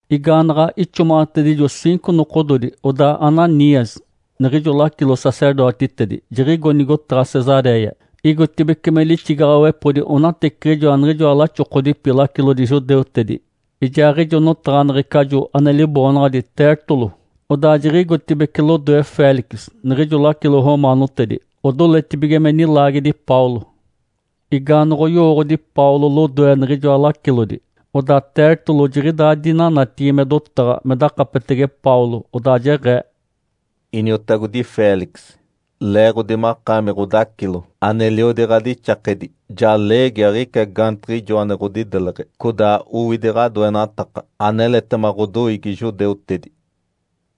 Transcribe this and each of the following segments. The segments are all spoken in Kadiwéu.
Igaanaɡ̶a ixomaɡ̶atedijo ciinco nokododi, odaa Ananias, niɡ̶ijo lacilo-sacerdotitedi, jiɡ̶igo nigotaɡ̶a Cesaréia. Igotibeci me lixigaɡ̶awepodi onateciɡ̶ijoa niɡ̶ijoa laxokodipi lacilodi judeutedi ijaaɡ̶ijo notaɡ̶aneɡ̶ecajo ane liboonaɡ̶adi Tértulo. Odaa jiɡ̶igotibeci lodoe Félix, niɡ̶ijo lacilo romaanotedi, odoletibige me nilaagedi Paulo. Igaanoɡ̶oyoodi Paulo lodoe niɡ̶ijoa lacilodi, odaa Tértulo jiɡ̶idaa dinanatigi me dotaɡ̶a me dakapetege Paulo, odaa jeɡ̶ee, “Iniotagodi Félix, leeɡ̶odi makaami ɡ̶odacilo aneliodi ɡ̶adixakedi, ja leegi aɡ̶ica gaantiɡ̶ijo ane ɡ̶odideleɡ̶e, codaa owidi ɡ̶adoenataka aneletema ɡ̶odoiigi judeutedi.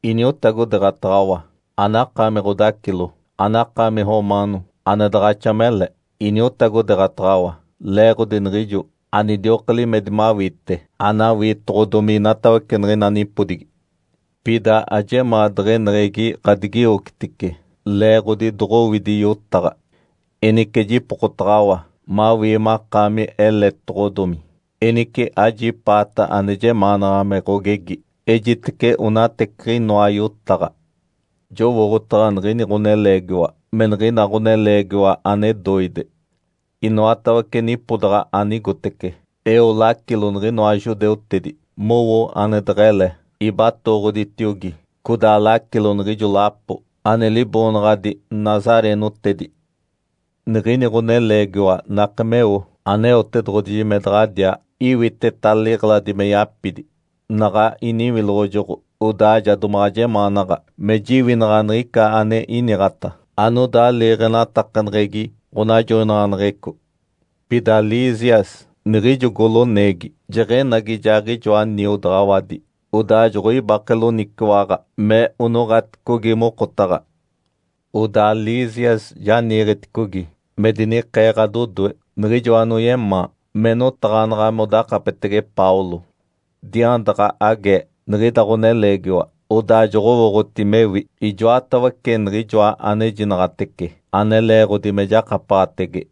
Iniotagodeeɡ̶ataɡ̶awa, anakaami ɡ̶odacilo, anakaami romaano, ane daɡ̶axa mele. Iniotagodeeɡ̶ataɡ̶awa leeɡ̶odi niɡ̶ijo anidioka limedi mawiite anawiitoɡ̶odomi inatawece niɡ̶ina nipodigi. Pida ajemaa deɡ̶eneɡ̶egi ɡ̶adigiwocitice leeɡ̶odi doɡ̶owidi yotaɡ̶a. Enice jipokotaɡ̶awa mawii makaami eletedoɡ̶odomi, enice ajipaata ane jemaanaɡ̶a me ɡ̶ogegi. Ejitece onateciɡ̶inoa yotaɡ̶a. Jowooɡ̶otaɡ̶a niɡ̶ini ɡ̶oneleegiwa me niɡ̶ina ɡ̶oneleegiwa ane doide. Inoatawece nipodaɡ̶a anigotece, eo lacilo niɡ̶inoa judeutedi mowo ane deɡ̶ele, ibatooɡ̶oditiogi, codaa lacilo niɡ̶ijo lapo ane liboonaɡ̶adi ‘nazareenotedi’. Niɡ̶ini ɡ̶oneleegiwa nake meo Aneotedoɡ̶oji me daɡ̶adiaa iwiteta liɡ̶eladi me yapidi. Naɡ̶a iniwiloɡ̶ojoɡ̶o odaa ja domaɡ̶a jemaanaɡ̶a me jiwinaɡ̶a niɡ̶ica ane iniɡ̶ata anodaa liiɡ̶enatakaneɡ̶egi ɡ̶onajoinaɡ̶aneɡ̶eco. Pida Lísias, niɡ̶ijo goloneegi, jeɡ̶enagi ijaaɡ̶ijoa niodaɡ̶awadi, odaa joɡ̶oibake loniciwaɡ̶a me onoɡ̶aticogi mokotaɡ̶a. Odaa Lísias ja niiɡ̶eticogi me dinikee ɡ̶adodoe niɡ̶ijo anoyemaa me notaɡ̶anaɡ̶a modakapetege Paulo. Diandaɡ̶a agee niɡ̶ida ɡ̶oneleegiwa, odaa joɡ̶owooɡ̶oti mewi ijoatawece niɡ̶ijoa anejinaɡ̶atece ane leeɡ̶odi me jakapaɡ̶atege.”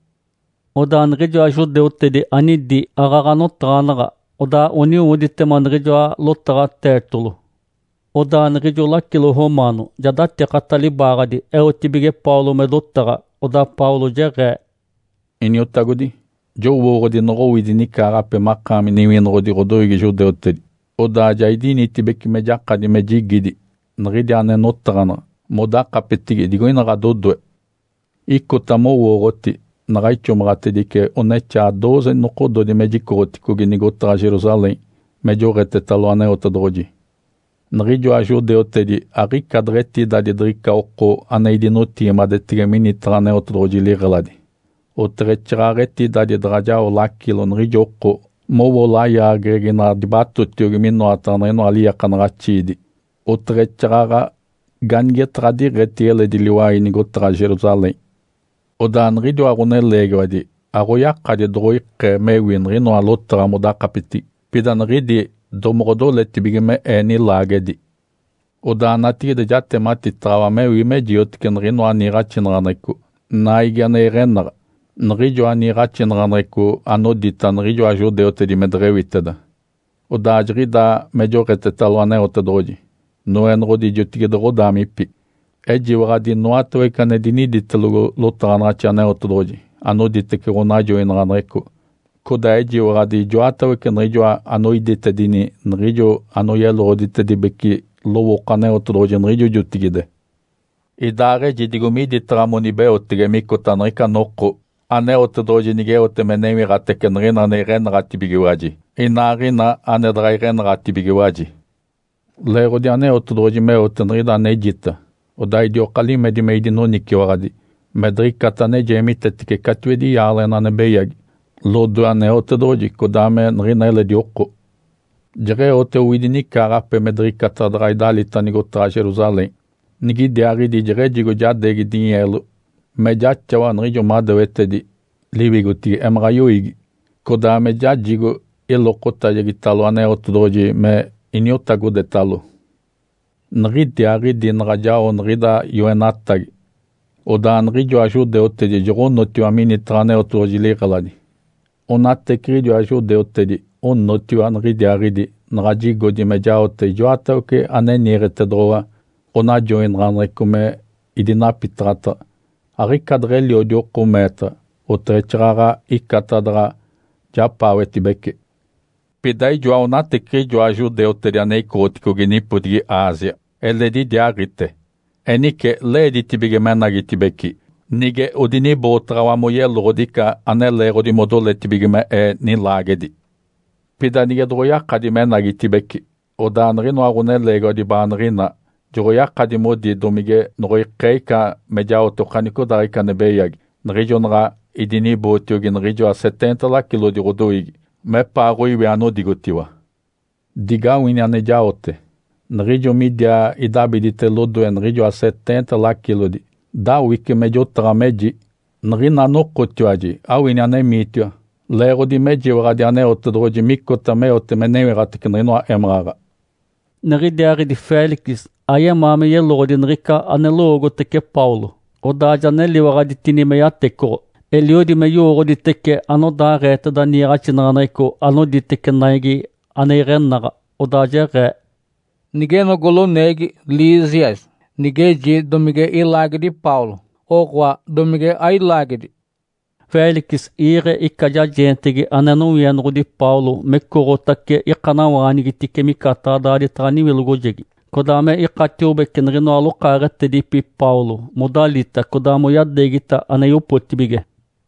Odaa niɡ̶ijoa judeutedi anidi aaɡ̶aɡ̶a notaɡ̶anaɡ̶a, odaa oniwoditema niɡ̶ijoa lotaɡ̶a Tértulo. Odaa niɡ̶ijo lacilo romaano ja datikata libaaɡ̶adi eotibige Paulo me dotaɡ̶a. Odaa Paulo jeɡ̶ee, “Iniotagodi, jowooɡ̶odi noɡ̶owidi nicaaɡ̶ape makaami niwinoɡ̶odi ɡ̶odoiigi judeutedi. Odaa ja idinitibeci me jakadi me jigidi niɡ̶idi ane notaɡ̶anaɡ̶a modakapetigi digoina ɡ̶adodoe. Icota mowooɡ̶oti naɡ̶a ixomaɡ̶atedice onexaa dooze nokododi me jicoɡ̶oticogi nigotaɡ̶a Jerusalém me joɡ̶etetalo Aneotedoɡ̶oji. Niɡ̶ijoa judeutedi aɡ̶ica deɡ̶etidadi diɡ̶ica oko ane idinotigimadetege minitaɡ̶a Aneotedoɡ̶oji liɡ̶eladi, oteɡ̶exaaɡ̶aɡ̶a etidadi daɡ̶a jao lacilo niɡ̶ijo oko mowo layaageɡ̶egi naɡ̶a dibatotiogi minoataɡ̶a niɡ̶inoa liiakanaɡ̶axiidi, oteɡ̶exaaɡ̶aɡ̶a ganigetaɡ̶a diɡ̶etigi eledi liwai nigotaɡ̶a Jerusalém. Odaa niɡ̶idiwa ɡ̶oneleegiwadi aɡ̶oyakadi doɡ̶oikee migewi niɡ̶inoa lotaɡ̶a modakapetigi, pida niɡ̶idi domoɡ̶odoletibige me ee nilaagedi. Odaa natigide jatematitaɡ̶awa mewi me jiotece niɡ̶inoa niiɡ̶axinaɡ̶aneɡ̶eco Naigi ane iɡ̶enaɡ̶a, niɡ̶ijoa niiɡ̶axinaɡ̶aneɡ̶eco anodita niɡ̶ijoa judeutedi me deɡ̶ewiteda. Odaa jiɡ̶idaa me joɡ̶etetalo Aneotedoɡ̶oji, Noenoɡ̶odi jotigide ɡ̶odaamipi. Ejiwaɡ̶adi inoatawece ane diniditelogo lotaɡ̶anaɡ̶axi Aneotedoɡ̶oji anoditece ɡ̶onajoinaɡ̶aneɡ̶eco, codaa ejiwaɡ̶adi ijoatawece niɡ̶ijoa anoiditedini niɡ̶ijo anoyeloɡ̶oditedibece lowooko Aneotedoɡ̶oji niɡ̶ijo jotigide. Idaaɡ̶eji digo miditaɡ̶a monibeotege micota niɡ̶ica noko Aneotedoɡ̶oji nigeote me newiɡ̶atace niɡ̶ina ane iɡ̶enaɡ̶atibigiwaji inaaɡ̶ina ane daɡ̶a iɡ̶enaɡ̶atibigiwaji. Leeɡ̶odi Aneotedoɡ̶oji meote niɡ̶ida anejita, odaa idioka limedi me idinoniciwaɡ̶adi me diɡ̶icata ane jeemitece catiwedi yaaleɡ̶ena ane beyagi lodoe Aneotedoɡ̶oji codaa me niɡ̶ina eledi oko. Jeɡ̶eote owidi nicaaɡ̶ape me diɡ̶icata daɡ̶a idalita nigotaɡ̶a Jerusalém. Niɡ̶idiaaɡ̶idi jeɡ̶ejigo jadeegi dinyeelo me jaxawa niɡ̶ijoa madewetedi liwigotigi emaɡ̶a yoiigi, codaa me jajigo ilokotajegitalo Aneotedoɡ̶oji me iniotagodetalo. Niɡ̶idiaaɡ̶idi naɡ̶a jao niɡ̶ida yoenatagi, odaa niɡ̶ijoa judeutedi joɡ̶onotiwa minitaɡ̶a Aneotedoɡ̶oji liɡ̶eladi. Onateciɡ̶idiwa judeutedi onotiwa niɡ̶idiaaɡ̶idi naɡ̶a jigodi me jaote ijoatawece ane niiɡ̶etedoɡ̶owa ɡ̶onajoinaɡ̶aneɡ̶eco me idinapitaɡ̶ataɡ̶a. Aɡ̶ica deɡ̶eliodi oko meetaɡ̶a, oteɡ̶exaaɡ̶aɡ̶a icata daɡ̶a japaawetibece. Pida ijoa onateciɡ̶ijoa judeutedi ane icoɡ̶oticogi nipodigi Ásia eledi idiaaɡ̶ite. Enice leeditibige menagitibeci nige odinibootaɡ̶awa moyeloɡ̶odi ica ane leeɡ̶odi modoletibige me ee nilaagedi. Pida nige doɡ̶oyakadi menagitibeci, odaa niɡ̶inoa ɡ̶oneleegiwadi baaniɡ̶inaa joɡ̶oyakadi modi domige noɡ̶oikee ica me jaote okanicodaaɡ̶ica ane beyagi niɡ̶ijo naɡ̶a idinibootiogi niɡ̶ijoa seteenta lacilodi ɡ̶odoiigi mepaaɡ̶oiwi anodigotiwa. Digawini ane jaote. Niɡ̶ijo midiaa idabidite lodoe niɡ̶ijoa seteenta lacilodi, dawice me jotaɡ̶a, meji, ‘Niɡ̶ina nokotiwaji awini anemiitiwa leeɡ̶odi mejiwaɡ̶adi Aneotedoɡ̶oji micota meote me newiɡ̶atace niɡ̶inoa émaɡ̶aɡ̶a.’” Niɡ̶idiaaɡ̶idi Félix ayemaa me yeloɡ̶odi niɡ̶ica ane lowoogotece Paulo, odaa ja neliwaɡ̶aditini me yatecoɡ̶o. Eliodi me yowooɡ̶oditece anodaaɡ̶eeteda niiɡ̶axinaɡ̶aneɡ̶eco anoditece Naigi ane iɡ̶enaɡ̶a. Odaa jeɡ̶ee, “Nigeno goloneegi Lísias, nigeji domige ilaagedi Paulo, oɡ̶oa domige ailaagedi.” Félix iiɡ̶e ica jajeentegi ane nowienoɡ̶odi Paulo mecoɡ̶otace ikanawaanigitice micataɡ̶a daaditaɡ̶a niwilogojegi, codaa me ikatiobece niɡ̶inoa lokaaɡ̶etedipi Paulo modalita codaa moyadeegita ane yopotibige.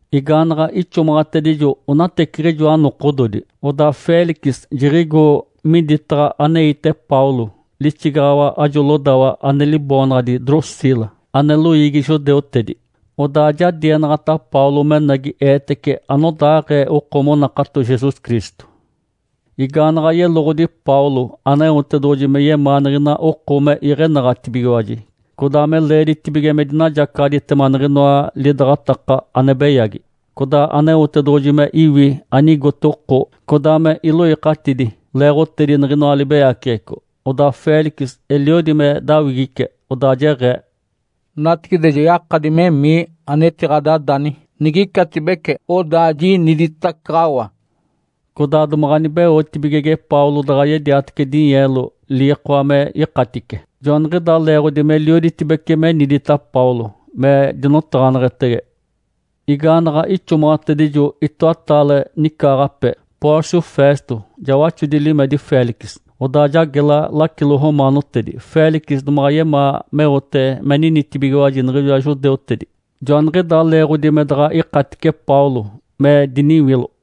Igaanaɡ̶a ixomaɡ̶atedijo onateciɡ̶ijoa nokododi, odaa Félix jiɡ̶igo miditaɡ̶a aneite Paulo lixigaɡ̶awa ajo lodawa ane liboonaɡ̶adi Drusila, ane loiigi judeutedi. Odaa ja dienaɡ̶ata Paulo menagi eetece anodaaɡ̶ee oko monakato Jesus Cristo. Igaanaɡ̶a yeloɡ̶odi Paulo Aneotedoɡ̶oji me yemaa niɡ̶ina oko me iɡ̶enaɡ̶atibigiwaji, codaa me leeditibige me dinajacaɡ̶aditema niɡ̶inoa lidaɡ̶ataka ane beyagi, codaa Aneotedoɡ̶oji me iwi anigote oko codaa me iloikatidi leeɡ̶otedi niɡ̶inoa libeyaceɡ̶eco. Odaa Félix eliodi me dawigice, odaa jeɡ̶ee, “Natigide ja yakadi memii anetiɡ̶adadani. Nigicatibece, odaa jiniditacaɡ̶awa.” Codaa domaɡ̶a nibeotibigege Paulo daɡ̶a yediatece dinyeelo liikoa me ikatice. Joaniɡ̶idaa leeɡ̶odi melioditibece menidita Paulo me dinotaɡ̶aneɡ̶etege. Igaanaɡ̶a ixomaɡ̶atedijo itoataale nicaaɡ̶ape, Pórcio Festo ja waxodi limedi Félix, odaa ja gela lacilo romaanotedi. Félix domaɡ̶a yemaa meote me ninitibigiwaji niɡ̶ijoa judeutedi, joaniɡ̶idaa leeɡ̶odi me daɡ̶a ikatice Paulo me diniwilo.